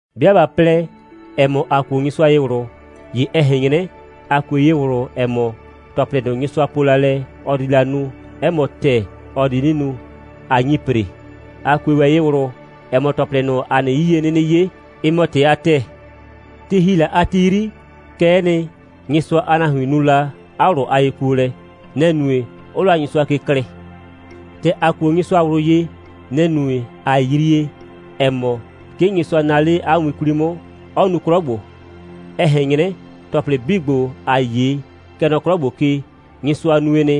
'Bɩa ꞊ba plɛ, ‑ɛ mɔ, ‑a kuo Nyɩsʋa ye ꞊wlʋ, ‑ye ɛ ꞊hɛn 'nyrɛ, ‑a kue ye ꞊wlʋ, ‑ɛ mɔ, ‑tɔplɩ ꞊nʋ, Nyɩsʋa po la lɛ, ɔ di la nu, 'ɛ mɔ ‑tɛɛ, ɔ di 'nɩ nu, ꞊a nyi ‑pre. ‑A kue ‑wɛ ye ꞊wlʋ, ‑ɛ mɔ, ‑tɔplɩ ꞊nʋ, ‑a nɩ 'yie 'nɩnɩ 'ye, ɩ mɔ ‑tɩ a ‑tɛɛ. Ti ‑hi la a ti 'yri, kɛ'ɛ nɩ, Nyɩsʋa a nahuin nu la 'a ꞊wlʋ a yekuolɛ. Nɛ‑ nue, 'ʋʋ la Nyɩsʋa ke klɩɩ. ‑Tɛ ‑a kuo Nyɩsʋa ꞊wlʋ ye, nɛ‑ nue, ꞊a yrie, ‑ɛ mɔ, 'ke Nyɩsʋa naa 'le 'a win 'kwli 'mʋ, 'ɔ nu 'klɔ ‑gbo. Ɛ ꞊hɛn 'nyrɛ, ‑tɔplɩ 'bii ‑gbo, ‑aa 'ye, kɛ nɔ 'klɔ ‑gbo ke, Nyɩsʋa nue nɩ,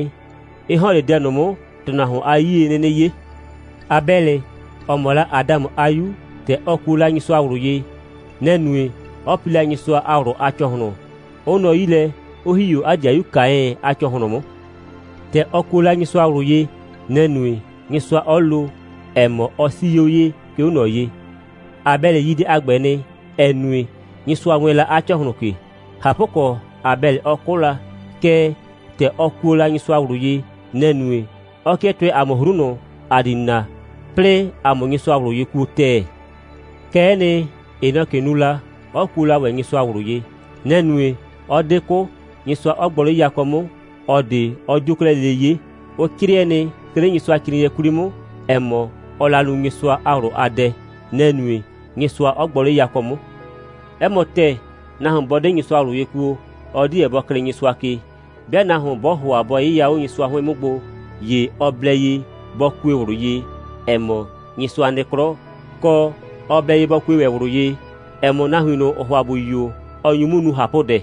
'ɩ ‑hɔn 'le dɛ ꞊nʋ 'mʋ, ‑tʋnahuon a 'yie 'nɩnɩ 'ye. Abɛlɩ, ‑ɔ mɔ la Adamʋ a 'yu, ‑tɛ ɔ kuo la Nyɩsʋa ꞊wlʋ ye, nɛ‑ nue, 'ɔ pi la Nyɩsʋa a ꞊wlʋ a ‑cɔhlʋn, 'ʋ nɔ 'yi lɛ, 'ʋ ‑hi 'o 'a 'dɩayu Kaɛn a ‑cɔhlʋn 'mʋ. ‑Tɛ ɔ kuo la Nyɩsʋa ꞊wlʋ ye, nɛ‑ nue, Nyɩsʋa 'ɔ lo, ‑ɛ mɔ, ɔ 'sii 'o ye, 'ke 'o ꞊nɔ ye. Abɛlɩ yi dɛ a ‑gbɛ nɩ, ‑ɛ nue, Nyɩsʋa wɛɛn la 'a ‑cɔhlʋn ke. ꞊Hapʋkɔ, Abɛlɩ 'ɔ 'kʋ la, kɛɛ, ‑tɛ ɔ kuo la Nyɩsʋa ꞊wlʋ ye, nɛ‑ nue, 'ɔ 'kɩɛ tʋɛ ‑a mʋ 'hru ꞊nʋ, ‑a di na, 'plɩɩ ‑a 'mʋ Nyɩsʋa ꞊wlʋ ye kuo ‑tɛɛ. Kɛ'ɛ nɩ, Henɔkɩ nu la, 'ɔ kuo la ‑wɛ Nyɩsʋa ꞊wlʋ ye. Nɛ‑ nue, 'ɔ 'de 'kʋ, Nyɩsʋa 'ɔ gbɔ 'le yakɔ 'mʋ, ꞊ɔ ꞊de 'ɔ 'dio la 'klɛɛ lele 'ye. Ʋ 'crɩɛ nɩ, 'ke 'le Nyɩsʋacrɩɩnɩɛ 'kwli 'mʋ, ‑ɛ mɔ, ɔɔ la nu Nyɩsʋa a ꞊wlʋ a dɛ. Nɛ‑ nue, Nyɩsʋa 'ɔ gbɔ 'le yakɔ 'mʋ. 'Ɛ mɔ ‑tɛɛ, nahuon 'bɔ 'de Nyɩsʋa ꞊wlʋ ye kuo, ɔ 'deɛ bɔ klɩɩ Nyɩsʋa ke. 'Bɩa nahuon 'bɔɔ ‑hʋa bɔ 'yɩya 'o Nyɩsʋa 'hʋɩn 'mʋ gbo, ‑ye ɔ blɛ ye bɔ kue ꞊wlʋ ye, ‑ɛ mɔ, Nyɩsʋa nɩ 'klɔ, kɔ, ɔ blɛ ye bɔ kue ‑wɛ ꞊wlʋ ye, ‑ɛ mɔ, nahuin ꞊nʋ, ‑ʋʋ ‑hʋa ‑bʋ yio, ɔ nyu 'mʋ nu ꞊hapʋdɛ.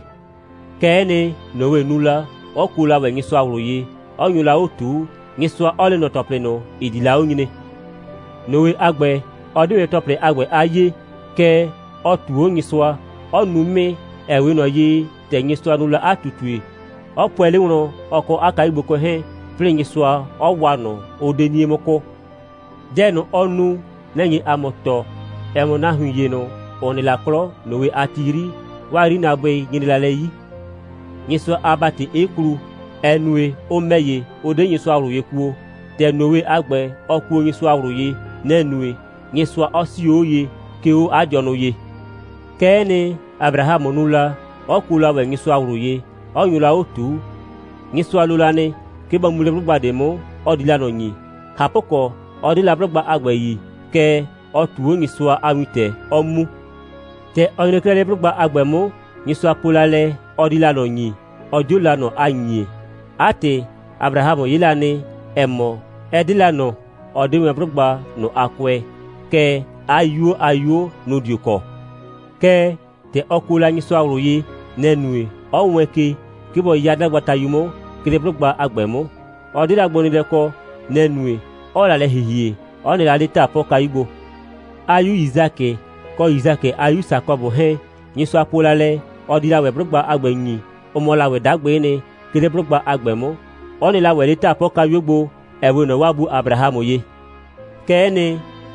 Kɛ'ɛ nɩ, Noe nu la, 'ɔ kuo la ‑wɛ Nyɩsʋa ꞊wlʋ ye, 'ɔ nyo la 'o ꞊tuu, Nyɩsʋa 'ɔ le ꞊nɔ ‑tɔplɩ ꞊nʋ, ‑ɩ di la 'o nyre. Noe a ‑gbɛ, ɔ 'de wɛn ‑tɔplɩ a ‑gbɛ a 'yee, kɛɛ, ɔ ꞊tuu 'o Nyɩsʋa, 'ɔ nu 'mɩɩ, ‑ɛ 'we ꞊nɔ ye, ‑tɛ Nyɩsʋa nu la 'a ꞊tutue, 'ɔ pʋɛ 'le wlɔn, ɔ kɔ 'a kayugbokʋɛ 'hɛɛn, 'plɩɩ Nyɩsʋa 'ɔ waa ꞊nʋ, 'ʋ 'de 'nie 'mʋ 'kʋʋ. Dɛ ꞊nʋ, ɔ nu, nɛ‑ nye ‑a mʋ tɔɔ, ‑ɛ mɔ, nahuin ‑ye ꞊nʋ, ‑ʋ nɩ la 'klɔ Noe a ti 'yri, 'waa 'yrinaabʋɩ nyre la lɛ 'yi, Nyɩsʋa a ‑bati 'ɩ klu, ‑ɛ nue, ʋ ‑mɛ ‑ye, ʋ 'de Nyɩsʋa ꞊wlʋ ye kuo. ‑Tɛ Noe a ‑gbɛ, ɔ kuo Nyɩsʋa ꞊wlʋ ye, nɛ‑ nue, Nyɩsʋa 'ɔ 'sio 'o ye, 'ke 'o 'a dɩɔnʋ ye. Kɛ'ɛ nɩ, Abrahamʋ nu la, 'ɔ kuo la ‑wɛ Nyɩsʋa ꞊wlʋ ye, 'ɔ nyo la 'o ꞊tuu. Nyɩsʋa lo la nɩ, 'ke bɔ mu 'le 'blʋgba ꞊de 'mʋ, ɔ di la ꞊nɔ ‑nyi. ꞊Hapʋkɔ, 'ɔ 'de la 'blʋgba a ‑gbɛ yi, kɛɛ, ɔ ꞊tuu 'o Nyɩsʋa a wintɛ, 'ɔ mu. ‑Tɛ ɔ nyre 'klɛɛ 'le 'blʋgba a ‑gbɛ 'mʋ, Nyɩsʋa po la lɛ, ɔ di la ꞊nɔ ‑nyi, ɔ 'dio la ꞊nɔ a ‑nyie. 'A ‑tɩ, Abrahamʋ 'ye la nɩ, ‑ɛ mɔ, ɛ 'de la ꞊nɔ, ɔ 'de wɛn 'blʋgba ꞊nʋ a kʋɛ, kɛɛ, 'a 'yuo a 'yuo, nʋ‑ dio kɔ. Kɛɛ, ‑tɛ ɔ kuo la Nyɩsʋa ꞊wlʋ ye, nɛ‑ nue, 'ɔ wɛɛn ke, 'ke bɔ 'ya 'dagbatayu 'mʋ, 'ke 'le 'blʋgba a ‑gbɛ 'mʋ. Ɔ 'de la gbonɩɩlɛ kɔ. Nɛ‑ nue, 'ɔɔ la lɛ ‑hihie, 'ɔ nɩ la 'le 'taapɔkayu gbo. 'A 'yu Yisakɩ, kɔ Yisakɩ a 'yu Sakɔbʋ 'hɛɛn, Nyɩsʋa po la lɛ, ɔ di la ‑wɛ 'blʋgba a ‑gbɛ ‑nyi, ʋ mɔ la ‑wɛ 'dagbɩ'ɩ nɩ, 'ke 'le 'blʋgba a ‑gbɛ 'mʋ, 'ʋ nɩ la ‑wɛ 'le 'taapʋɛkayuo gbo, ‑ɛ 'we ꞊nɔ 'waa bu Abrahamʋ ye. Kɛ'ɛ nɩ,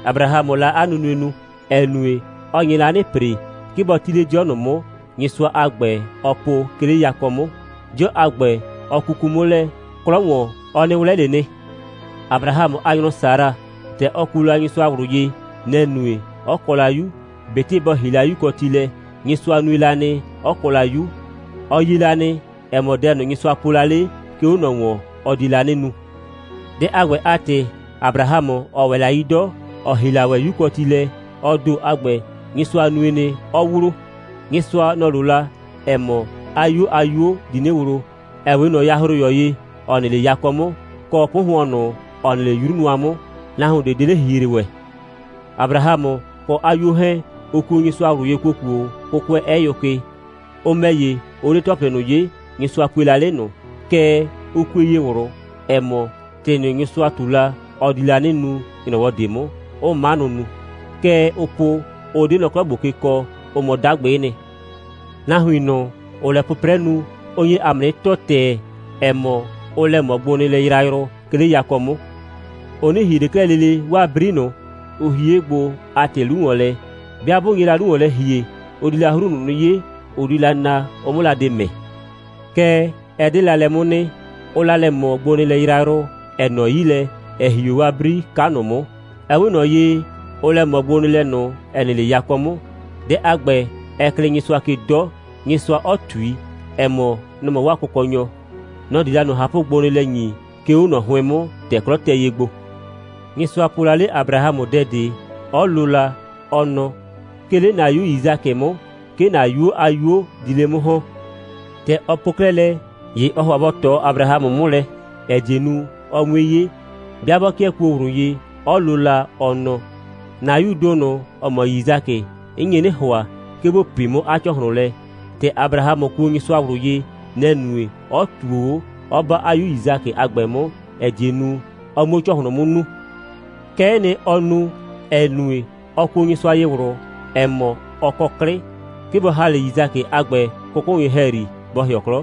Abrahamʋʋ la 'a nunue nu, ‑ɛ nue, ɔ nye la 'nɩ ‑pre, 'ke bɔ 'ti 'le 'dɩɔ ꞊nʋ 'mʋ, Nyɩsʋa a ‑gbɛ, ɔ po, 'ke 'le yakɔ 'mʋ. 'Dɩɔ a ‑gbɛ, ɔ kuku 'mʋ lɛ, 'klɔ ‑wɔn, ɔ 'nɩ 'wlɛ ꞊le nɩ. Abrahamʋ a nyrɔ Sara, ‑tɛ ɔ kuo la Nyɩsʋa ꞊wlʋ ye, nɛ‑ nue, 'ɔ kɔ la 'yu. ꞊Betɩ bɔ ‑hi la 'yukɔti lɛ, Nyɩsʋa nue la nɩ, 'ɔ kɔ la 'yu. Ɔ yie la nɩ, ‑ɛ mɔ, dɛ ꞊nʋ, Nyɩsʋa po la 'le, 'ke 'o ꞊nɔ ‑wɔn, ɔ die la 'nɩ nu. Dɛ a ‑gbɛ a ‑tɩ, Abrahamʋ, ‑ɔ ‑wɛ la 'yi 'dɔ, ‑ɔ ‑hi la ‑wɛ 'yukɔti lɛ, ɔ ‑do a ‑gbɛ, Nyɩsʋa nue nɩ, 'ɔ wlo. Nyɩsʋa, nɔ‑ lo la, ‑ɛ mɔ, 'a 'yuo a 'yuo di 'nɩ wlo, ‑ɛ 'we ꞊nɔ yahroyɔ ye, ‑ɔ nɩ 'le yakɔ 'mʋ, kɔ 'pʋhʋɔn ꞊nʋ, ‑ɔ nɩ 'le 'yru nʋa 'mʋ, nahuon ꞊de 'de 'le ‑hihre ‑wɛ. Abrahamʋ kɔ 'a 'yuo 'hɛɛn, ʋ kuo Nyɩsʋa ꞊wlʋ ye ‑kuokuo, 'kʋkʋɛ 'ɛ yʋ ke. Ʋ ‑mɛ ‑ye, ʋ 'de ‑tɔplɩ ꞊nʋ 'ye, Nyɩsʋa pue la 'le ꞊nʋ. Kɛɛ, ʋ kue ye ꞊wlʋ, ‑ɛ mɔ, ‑tɩ ꞊nʋ, Nyɩsʋa ꞊tu la, ɔ di la 'nɩ nu ‑nyrɔwɔ ꞊de 'mʋ, 'ʋʋ 'manʋ nu. Kɛ ʋʋ po, ʋ 'de nɔ 'klɔ ‑gbo ke kɔ, ʋ mɔ 'dagbɩ'ɩ nɩ. Nahuin ꞊nʋ, ‑ʋʋ lɛ 'pʋprɛ nu, ʋ nye ‑a mʋ 'nɩ tɔɔ ‑tɛɛ, ‑ɛ mɔ, ʋʋ lɛ ꞊mɔ gbonɩɩlɛ yrayrʋ, 'ke 'le yakɔ 'mʋ. Ʋ 'nɩ ‑hie ꞊le 'klɛɛ lele 'waa 'bri ꞊nʋ, ʋ hie 'o gbo a ‑tɩ 'lu ‑wɔn lɛ. 'Bɩa 'bʋ nye la 'lu ‑wɔn lɛ ‑hie, ʋ di la 'hru ꞊nʋ 'nɩ 'ye, ʋ di la na, ʋ 'mʋ la de ‑mɛ. Kɛɛ, ɛ 'de la lɛ 'mʋ nɩ. Ʋʋ la lɛ ꞊mɔ gbonɩɩlɛ yrayrʋ, ‑ɛ nɔ 'yi lɛ, 'ɛ ‑hi 'o 'bri 'ka ꞊nʋ 'mʋ. Ɛ 'we ꞊nɔ ye, ʋʋ lɛ ꞊mɔ gbonɩɩlɛ ꞊nʋ, ‑ɛ nɩ 'le yakɔ 'mʋ. Dɛ a ‑gbɛ, ɛ klɩɩ Nyɩsʋa ke 'dɔ, Nyɩsʋa 'ɔ ꞊tui, ‑ɛ mɔ, nɔ‑ mɔ 'waa Kʋkɔnyɔ. Nɔ‑ di la ꞊nʋ ꞊hapʋgbonɩɩlɛ ‑nyi, 'ke 'o ꞊nɔ 'hʋɩn 'mʋ, ‑tɛ 'klɔ tɛ ye gbo. Nyɩsʋa po la 'le Abrahamʋ dɛ ꞊de, 'ɔ lo la, ɔ nɔ: «'Ke 'le ‑na 'yu Yisakɩ 'mʋ, 'ke ‑na 'yuo a 'yuo di 'le 'mʋ ‑hɔn.» ‑Tɛ ɔ po 'klɛɛ lɛ, ‑ye ɔɔ ‑hʋa bɔ ꞊tɔ Abrahamʋ 'mʋ lɛ, ‑ɛ die nu, ɔ 'mue 'ye, 'bɩa 'bɔ 'kɩɛ kuo ꞊wlʋ ye, 'ɔ lo, ɔ nɔ: «‑Na 'yuu ‑do ꞊nʋ, ‑ɔ mɔ Yisakɩ, 'n nye 'nɩ ‑hʋa, 'ke ‑bo pii 'mʋ 'a ‑cɔhlʋn lɛ.» ‑Tɛ Abrahamʋ kuo Nyɩsʋa ꞊wlʋ ye, nɛ‑ nue, 'ɔ ꞊tuo 'o, 'ɔ 'ba 'a 'yu Yisakɩ a ‑gbɛ 'mʋ, ‑ɛ die nu, ɔ 'muo ‑cɔhlʋn 'mʋ nuu. Kɛ'ɛ nɩ, ɔ nu, ‑ɛ nue, ɔ kuo Nyɩsʋa ye ꞊wlʋ, ‑ɛ mɔ, ɔ kɔ 'klɩ, 'ke bɔ ‑ha 'le Yisakɩ a ‑gbɛ 'kʋkʋnyʋ ‑hɛyri, bɔ ‑hɩɔ 'klɔ.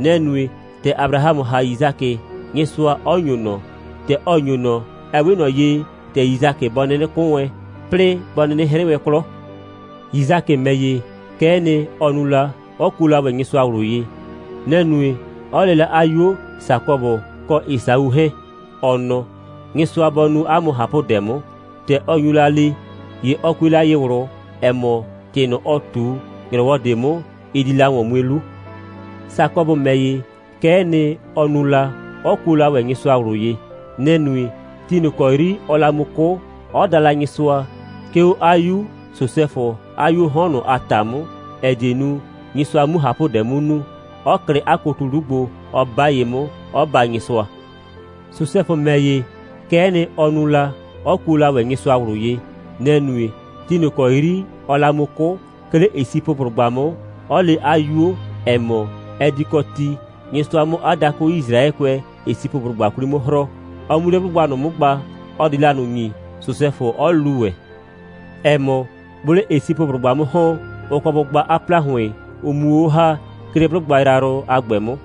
Nɛ‑ nue, ‑tɛ Abrahamʋ ‑ha Yisakɩ, Nyɩsʋa 'ɔ ‑nyo ꞊nɔ. ‑Tɛ ɔ ‑nyo ꞊nɔ, ɛ 'we ꞊nɔ ye, ‑tɛ Yisakɩ bɔ 'nɩnɩ 'kʋ wɛn, 'plɩɩ, bɔ 'nɩnɩ 'hrɩ wɛn 'klɔ. Yisakɩ ‑mɛ ‑ye, kɛ'ɛ nɩ, ɔ nu la, 'ɔ kuo la ‑wɛ Nyɩsʋa ꞊wlʋ ye. Nɛ‑ nue, 'ɔ le la 'a 'yuo Sakɔbʋ kɔ Esau 'hɛɛn, ɔ nɔ: «Nyɩsʋa bɔ nu 'a mʋ ꞊hapʋdɛ 'mʋ.» ‑Tɛ ɔ nyu la le, ‑ye ɔ kue la ye ꞊wlʋ, ‑ɛ mɔ, ‑tɩ ꞊nʋ, ɔ ꞊tu, ‑nyrɔwɔ ꞊de 'mʋ, ɩ di la ‑wɔn mue 'lu. Sakɔbʋ ‑mɛ ‑ye, kɛ'ɛ nɩ, ɔ nu la, 'ɔ kuo la ‑wɛ Nyɩsʋa ꞊wlʋ ye. Nɛ‑ nue, ti ꞊nʋ ‑kɔ 'yri ɔɔ la mu 'kʋ, 'ɔ da la Nyɩsʋa, 'ke 'o 'a 'yu Sosɛfʋ a 'yuoo 'hɔn ꞊nʋ a ‑ta 'mʋ, ‑ɛ die nu, Nyɩsʋa 'mu ꞊hapʋdɛ 'mʋ nu, 'ɔ klɩ 'a kotu 'lu gbo, 'ɔ 'ba ye 'mʋ, 'ɔ baa Nyɩsʋa. Sosɛfʋ ‑mɛ ‑ye, kɛ'ɛ nɩ, ɔ nu la, 'ɔ kuo la ‑wɛ Nyɩsʋa ꞊wlʋ ye. Nɛ‑ nue, ti ꞊nʋ ‑kɔ 'yri ɔɔ la mu 'kʋ, 'ke 'le Esipʋblʋgba 'mʋ, 'ɔ le 'a 'yuo, ‑ɛ mɔ, ɛ di kɔ ti, Nyɩsʋa 'mʋ 'a dakʋ Yisraɛkʋɛ Esipʋblʋgba 'kwli 'mʋ 'hrɔɔ, ɔ 'mu 'le 'blʋgba ꞊nʋ 'mʋ gba, ɔ di la ꞊nʋ ‑nyi, Sosɛfʋ 'ɔ lu ‑wɛ, ‑ɛ mɔ, 'bʋʋ 'le Esipʋblʋgba 'mʋ ‑hɔn, ʋ kɔ bʋ gba 'a ‑plahʋɩn, ʋ 'muo 'o ‑ha, 'ke 'le 'blʋgba yrayrʋ a ‑gbɛ 'mʋ.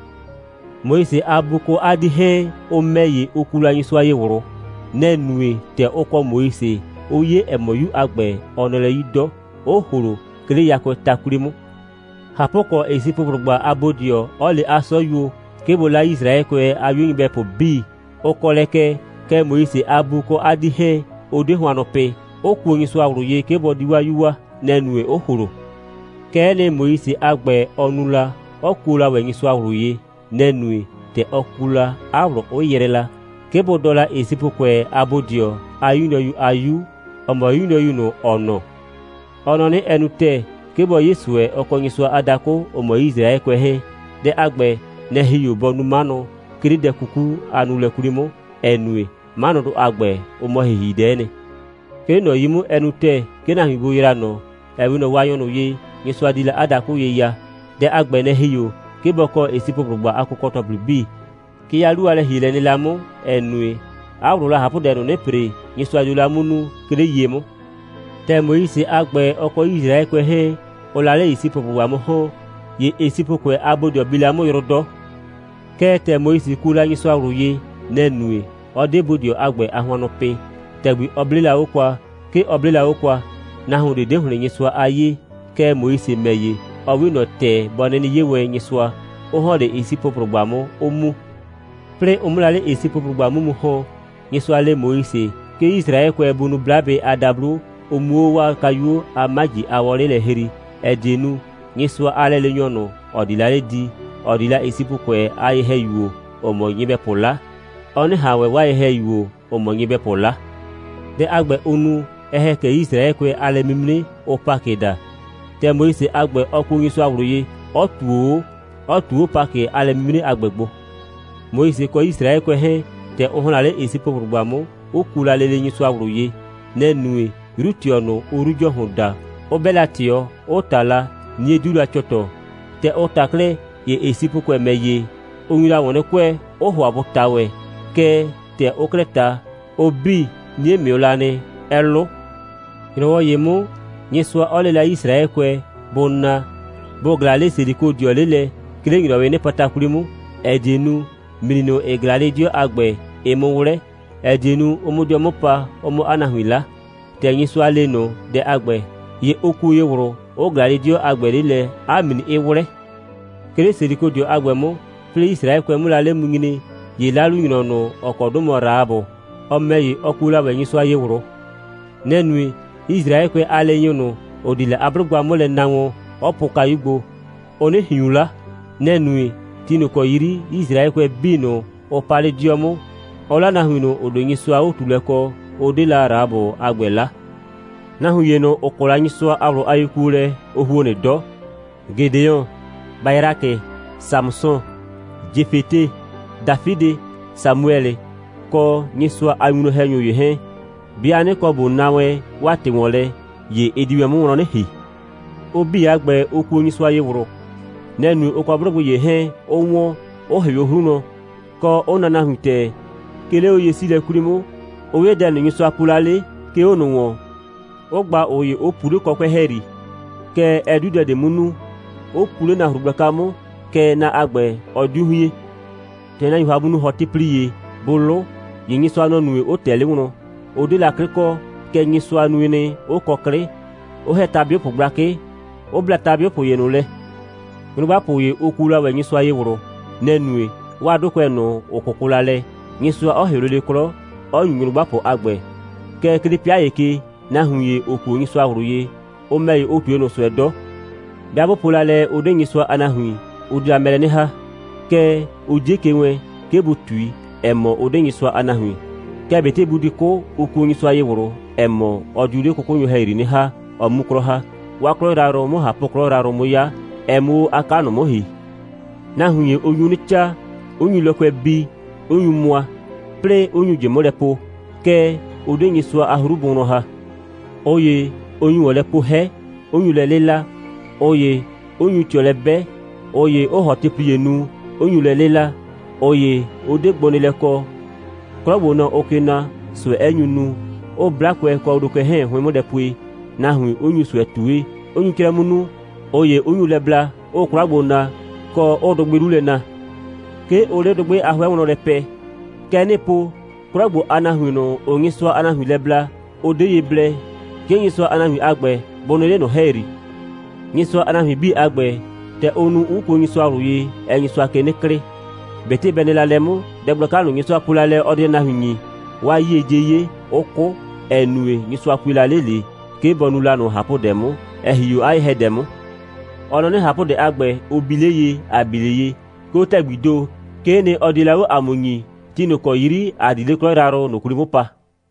Moise a bu kɔ 'a 'dii 'hɛɛn, ʋ ‑mɛ ‑ye, ʋ kuo la ‑wɛ Nyɩsʋa ye ꞊wlʋ. Nɛ‑ nue, ‑tɛ ʋ kɔ Moise, ʋ 'ye, ‑ɛ mɔ, 'yu a ‑gbɛ, ɔ nɔ lɛ 'yi 'dɔ, 'ʋ ‑hlo, 'ke 'le yakʋɛɛ ta 'kwli 'mʋ. ꞊Hapʋkɔ, Esipʋblʋgba a bodɩɔ 'ɔ le 'a 'sɔyuo, 'ke bʋ 'la Yisraɛkʋɛ a 'yu nyɩbɛpʋ 'bii, ʋ kɔ lɛ kɛ, kɛɛ, Moise a bu kɔ 'a 'dii 'hɛɛn, ʋ 'de hʋannʋ pɩ, 'ʋ kuo Nyɩsʋa ꞊wlʋ ye, 'ke bɔ di 'waa 'yu waa. Nɛ‑ nue, 'ʋ ‑hlo. Kɛ'ɛ nɩ, Moise a ‑gbɛ, ɔ nu la, 'ɔ kuo la ‑wɛ Nyɩsʋa ꞊wlʋ ye. Nɛ‑ nue, ‑tɛ ɔ ku la, 'a ꞊wlʋ 'ʋ yrɛɛ la, 'ke bʋ dɔɔ la Esipʋkʋɛ a bodɩɔ a 'yu nyrɔyu a 'yu, ‑ɔ mɔ 'yu nyrɔyu ꞊nʋ, ‑ɔ nɔɔ. Ɔ nɔ 'nɩ, ɛ nu ‑tɛɛ, 'ke bɔ 'ye ꞊sʋɛ, ɔ kɔ Nyɩsʋa a dakʋ, ‑ʋ mɔ Yisraɛkʋɛ 'hɛɛn. Dɛ a ‑gbɛ, nɛ‑ ‑hi 'o bɔ nu 'manʋ, 'ke 'le dɛ 'kuku a nuulɛ 'kwli 'mʋ, ‑ɛ nue, 'manʋdʋ a ‑gbɛ, ʋ mɔ ‑hihidɛ'ɛ nɩ. 'Ke 'le ꞊nɔ 'yi 'mʋ, ɛ nu ‑tɛɛ, 'ke nahuin bʋ yraa ꞊nɔ, ‑ɛ 'we ꞊nɔ Waanyɔ ꞊nʋ ye, Nyɩsʋa di la 'a dakʋ ye ya. Dɛ a ‑gbɛ, nɛ‑ ‑hi 'o, 'ke bɔ kɔ Esipʋblʋgba a kʋkɔ‑tɔplɩ 'bii. Kɛ 'a 'lu a lɛ‑hielɛ nɩ la 'mʋ, ‑ɛ nue, 'a ꞊wlʋʋ la ꞊hapʋdɛ ꞊nʋ 'nɩ ‑pre, Nyɩsʋa dio la 'mʋ nu, 'ke 'le ye 'mʋ. ‑Tɛ Moise a ‑gbɛ, ɔ kɔ Yisraɛkʋɛ 'hɛɛn, ʋʋ la 'le Esipʋblʋgba 'mʋ mu ‑hɔn, ‑ye Esipʋkʋɛ a bodɩɔ bi la 'mʋ yrʋ 'dɔ. Kɛɛ, ‑tɛ Moise kuo la Nyɩsʋa ꞊wlʋ ye, nɛ‑ nue, 'ɔ 'de bodɩɔ a ‑gbɛ a hʋannʋ pɩ. ‑Tɛgbi ɔ 'blee la 'o kwa, 'ke ɔ 'blee la 'o kwa. Nahuon ꞊de 'de ‑hlɩn Nyɩsʋa a 'yee. Kɛɛ, Moise ‑mɛ ‑ye, ɔ 'we ꞊nɔ ‑tɛ bɔ 'nɩnɩ 'ye wɛn Nyɩsʋa, 'ʋ ‑hɔn 'le Esipʋblʋgba 'mʋ, 'ʋ mu. 'Plɩɩ ʋ 'mʋ la 'le Esipʋblʋgba 'mʋ mu ‑hɔn, Nyɩsʋa le Moise, 'ke Yisraɛkʋɛ bʋ nu 'blabɩ a dablo, ʋ 'muo 'o 'waa kayuo a 'maji a wɔlɩ' lɛ hrii, ‑ɛ die nu, Nyɩsʋa a lɛleenyɔ ꞊nʋ, ‑ɔ di la 'le di, ‑ɔ di la Esipʋkʋɛ a ye‑hɛyuo, ‑ʋ mɔ nyɩbɛpʋ 'la, ɔ 'nɩ ꞊han ‑wɛ 'waa ye‑hɛyuo, ‑ʋ mɔ nyɩbɛpʋ 'la. Dɛ a ‑gbɛ, ʋ nu, ɛ ‑hɛ kɛ Yisraɛkʋɛ a lɛ'mimre, ʋʋ Pakɩ daa. ‑Tɛ Moise a ‑gbɛ, ɔ kuo Nyɩsʋa ꞊wlʋ ye, 'ɔ ꞊tuo 'o, 'ɔ ꞊tu 'o Pakɩ a lɛ'mimre a ‑gbɛ gbo. Moise kɔ Yisraɛkʋɛ 'hɛɛn, ‑tɛ ʋ ‑hɔn la 'le Esipʋblʋgba 'mʋ, 'ʋ kuo la lele Nyɩsʋa ꞊wlʋ ye. Nɛ‑ nue, 'yru꞊tɩɔ ꞊nʋ, ʋʋ 'Yru ‑Jɔhʋn daa, 'ʋ 'bɛ la ꞊tɩɔ, 'ʋ ꞊ta la, 'nie 'diu la cɔtɔ. ‑Tɛ ʋ ꞊ta 'klɛɛ, ‑ye Esipʋkʋɛ ‑mɛ ‑ye, ʋ nyu la ‑wɔn 'nɩ kʋɛ, 'ʋ ‑hʋa bʋ ꞊ta ‑wɛ. Kɛɛ, ‑tɛ ʋʋ 'klɛɛ ꞊ta, ʋ 'bii, 'nie ꞊mɩʋ la nɩ, 'ɛ 'lʋ. ‑Nyrɔwɔ ‑ye 'mʋ, Nyɩsʋa 'ɔ le la Yisraɛkʋɛ, bʋ na, bʋ ꞊glaa 'le Selikodɩɔ 'le lɛ, 'ke 'le ‑nyrɔwɩɩ 'nɩpata 'kwli 'mʋ, ‑ɛ die nu, ‑mli ꞊nʋ, ‑ɩ ꞊glaa 'le 'dɩɔ a ‑gbɛ, ɩ 'mʋ 'wlɛ, ‑ɛ die nu, ʋ 'mʋ 'dɩɔ 'mʋ pa, ʋ 'mʋ 'a nahuin 'la. ‑Tɛ Nyɩsʋa le ꞊nʋ dɛ a ‑gbɛ, ‑ye ʋ kuo ye ꞊wlʋ, 'ʋ ꞊glaa 'le 'dɩɔ a ‑gbɛ 'le lɛ, 'a ‑mli 'ɩ 'wlɛ. 'Ke 'le Selikodɩɔ a ‑gbɛ 'mʋ, 'plɩɩ Yisraɛkʋɛ 'mʋ la 'le mu nyre, ‑ye 'lalunyrɔ ꞊nʋ, ‑ɔ kɔ 'dʋ mɔ Rahabʋ, ɔ ‑mɛ ‑ye, ɔ kuo la ‑wɛ Nyɩsʋa ye ꞊wlʋ. Nɛ‑ nue, Yisraɛkʋɛ a leenyʋ ꞊nʋ, ‑ʋ di la 'a 'blʋgba 'mʋ lɛ na wɔn, 'ɔ pʋʋ kayu gbo, ʋ 'nɩ ꞊hiun 'la. Nɛ‑ nue, ti ꞊nʋ ‑kɔ yri Yisraɛkʋɛ 'bii ꞊nʋ, ʋ pa 'le 'dɩɔ 'mʋ, 'ʋ 'la nahuin ꞊nʋ, ‑ʋ 'de Nyɩsʋa a 'o꞊tuulɛ kɔ, 'ʋ 'de la Rahabʋ a ‑gbɛ 'la. Nahuin ‑ye ꞊nʋ, ‑ʋ kɔ la Nyɩsʋa a ꞊wlʋ a yekuolɛ, ʋ ‑huo nɩ 'dɔ: Gedeon, Bayrakɩ, Samʋsɔ, Jefete, Dafidɩ, Samuɛlɩ, kɔ Nyɩsʋa a winwlɔn‑hɛnyʋ ‑ye 'hɛɛn. 'Bɩa 'nɩ kɔ ꞊bo na wɛn 'waa ‑tɩ ‑wɔn lɛ, ‑ye ɛ di wɛn 'mʋ wlɔn 'nɩ ‑hi. Ʋ 'bii a ‑gbɛ, ʋ kuo Nyɩsʋa ye ꞊wlʋ. Nɛ‑ nue, ʋ kɔ 'blʋgbɩ ‑ye 'hɛɛn, 'ʋ ‑wɔn, 'ʋ ‑hɩʋ 'o 'hru wlɔn, kɔ, 'ʋ naa nahuin ‑tɛɛ, 'ke 'le 'oye'siilɛ 'kwli 'mʋ, 'ʋ 'ye dɛ ꞊nʋ, Nyɩsʋa po la 'le, 'ke 'o ꞊nʋ ‑wɔn, 'ʋ gba ꞊ʋ ‑ye, 'ʋ pu 'le kɔkʋɛ' ‑hɛyri, kɛɛ, ɛ 'diu dɛ ꞊de 'mʋ nu, 'ʋ pu 'le nahru gblaka 'mʋ, kɛɛ, na a ‑gbɛ, ɔ 'diu hien. ‑Tɛ nahuiin ‑hʋa bʋ nu ‑hɔtɩplie, bʋ 'lʋ, ‑ye Nyɩsʋa, nɔ‑ nue, 'ʋ ꞊tɛ 'le wlɔn. Ʋ 'de la 'klɩ kɔ, kɛɛ, Nyɩsʋa nue nɩ, 'ʋ kɔ 'klɩ, 'ʋ ‑hɛ ta'bɩʋpʋ gblakɩ, 'ʋ bla ta'bɩʋpʋ ‑ye ꞊nʋ lɛ. Nyrʋgbapʋ ‑ye, ʋ kuo la ‑wɛ Nyɩsʋa ye ꞊wlʋ. Nɛ‑ nue, 'waa 'dʋkʋɛ ꞊nʋ, ‑ʋ 'kʋkʋ la lɛ, Nyɩsʋa 'ɔ ‑hɩʋ lele 'klɔ, 'ɔ ‑nyu nyrʋgbapʋ a ‑gbɛ. Kɛɛ, 'ke 'le 'pɩa ‑ye ke, nahuin ‑ye, ‑ʋ kuo Nyɩsʋa ꞊wlʋ ye, ʋ ‑mɛ ‑ye, ʋ ꞊tue ꞊nʋ ꞊sʋɛ 'dɔ. 'Bɩa 'bʋ po la lɛ, ʋ 'de Nyɩsʋa a nahuin, ʋ diu la mɛ lɛ 'nɩ ‑ha. Kɛɛ, ʋ 'die ke wɛɛn, 'ke bʋ ꞊tui, ‑ɛ mɔ, ʋ 'de Nyɩsʋa a nahuin. Kɛɛ, ꞊betɩ bʋ di 'kʋ, ʋ kuo Nyɩsʋa ye ꞊wlʋ, ‑ɛ mɔ, ɔ diu 'le 'kʋkʋnyʋ ‑hɛyri 'nɩ ‑ha, ɔ 'mu 'klɔ ‑ha, 'waa 'klɔ yrayrʋ 'mʋ ꞊hapʋ'klɔ 'mʋ 'ya, ɛ 'mʋ 'o 'a 'ka ꞊nʋ 'mʋ ‑hi. Nahuin ‑ye, ʋ nyu 'nɩ 'caa, 'ʋ nyu lɔkʋɛ bii, 'ʋ nyu mʋa, 'plɩɩ 'ʋ nyu ꞊jɩ 'mʋ lɛ po, kɛɛ, ʋ 'de Nyɩsʋa a 'hru bʋ wlɔn ‑ha. ꞊Ʋ ‑ye, ʋ nyu ‑wɔn lɛ poo 'hɛ, 'ʋ nyu lɛ 'lɩla, ꞊ʋ ‑ye 'ʋ nyu ꞊tɩɔ lɛ 'bɛ, ꞊ʋ ‑ye 'ʋʋ ‑hɔtɩplie nu, 'ʋ nyu lɛ 'lɩla, ꞊ʋ ‑ye 'ʋ 'de gbonɩɩlɛ kɔ, 'klɔ ‑gbo, nɔ‑ ʋʋ ke na, ꞊sʋɛ 'ɛ nyu nu, 'ʋʋ 'blakʋɛ kɔ wlokʋɛ 'hʋɩn 'mʋ lɛ pue, nahuin 'ʋ nyu ꞊sʋɛ ꞊tue, 'ʋ nyu 'crɛ 'mʋ nu, ꞊ʋ ‑ye, 'ʋ nyu lɛ bla, 'ʋʋ 'kwla gbo na, kɔ, 'ʋʋ dʋgbɩ 'lu lɛ na. 'Ke ʋʋ 'le dʋgbɩ a 'hʋɛ wlɔn lɛ pɛɛ. Kɛ 'nɩɩ po, 'klɔ ‑gbo a nahuin ꞊nʋ, ‑ʋʋ Nyɩsʋa a nahuin lɛ bla, ʋ 'de ye blɛ, 'ke Nyɩsʋa a nahuin a ‑gbɛ bʋ nɩ 'le ꞊nʋ ‑hɛyri. Nyɩsʋa a nahuin 'bii a ‑gbɛ, ‑tɛ ʋ nu, 'ʋ kuo Nyɩsʋa ꞊wlʋ ye, ɛɛ Nyɩsʋa ke 'nɩ klɩɩ. ꞊Betɩ bɛ nɩ la lɛ 'mʋ, dɛ gblaka ꞊nʋ, Nyɩsʋa po la lɛ, ɔ di la nahuin ‑nyi, 'waa 'yie 'die 'ye, 'ʋ 'kʋ, ‑ɛ nue, Nyɩsʋa pue la 'le ꞊le, 'ke bɔ nu la ꞊nʋ ꞊hapʋdɛ 'mʋ, ‑ɛ ‑hi 'o 'a ye‑hɛdɛ 'mʋ. Ɔ nɔ 'nɩ, ꞊hapʋdɛ a ‑gbɛ, ʋ bi 'le ye, ‑a bi 'le ye, 'ke 'o ‑tɛgbii ‑do, 'kee 'nɩ, ɔ die la 'o ‑a mʋ ‑nyii, ti ꞊nʋ ‑kɔ 'yri ‑a di 'le 'a 'klɔ yrayrʋ ꞊nʋ 'kwli 'mʋ pa.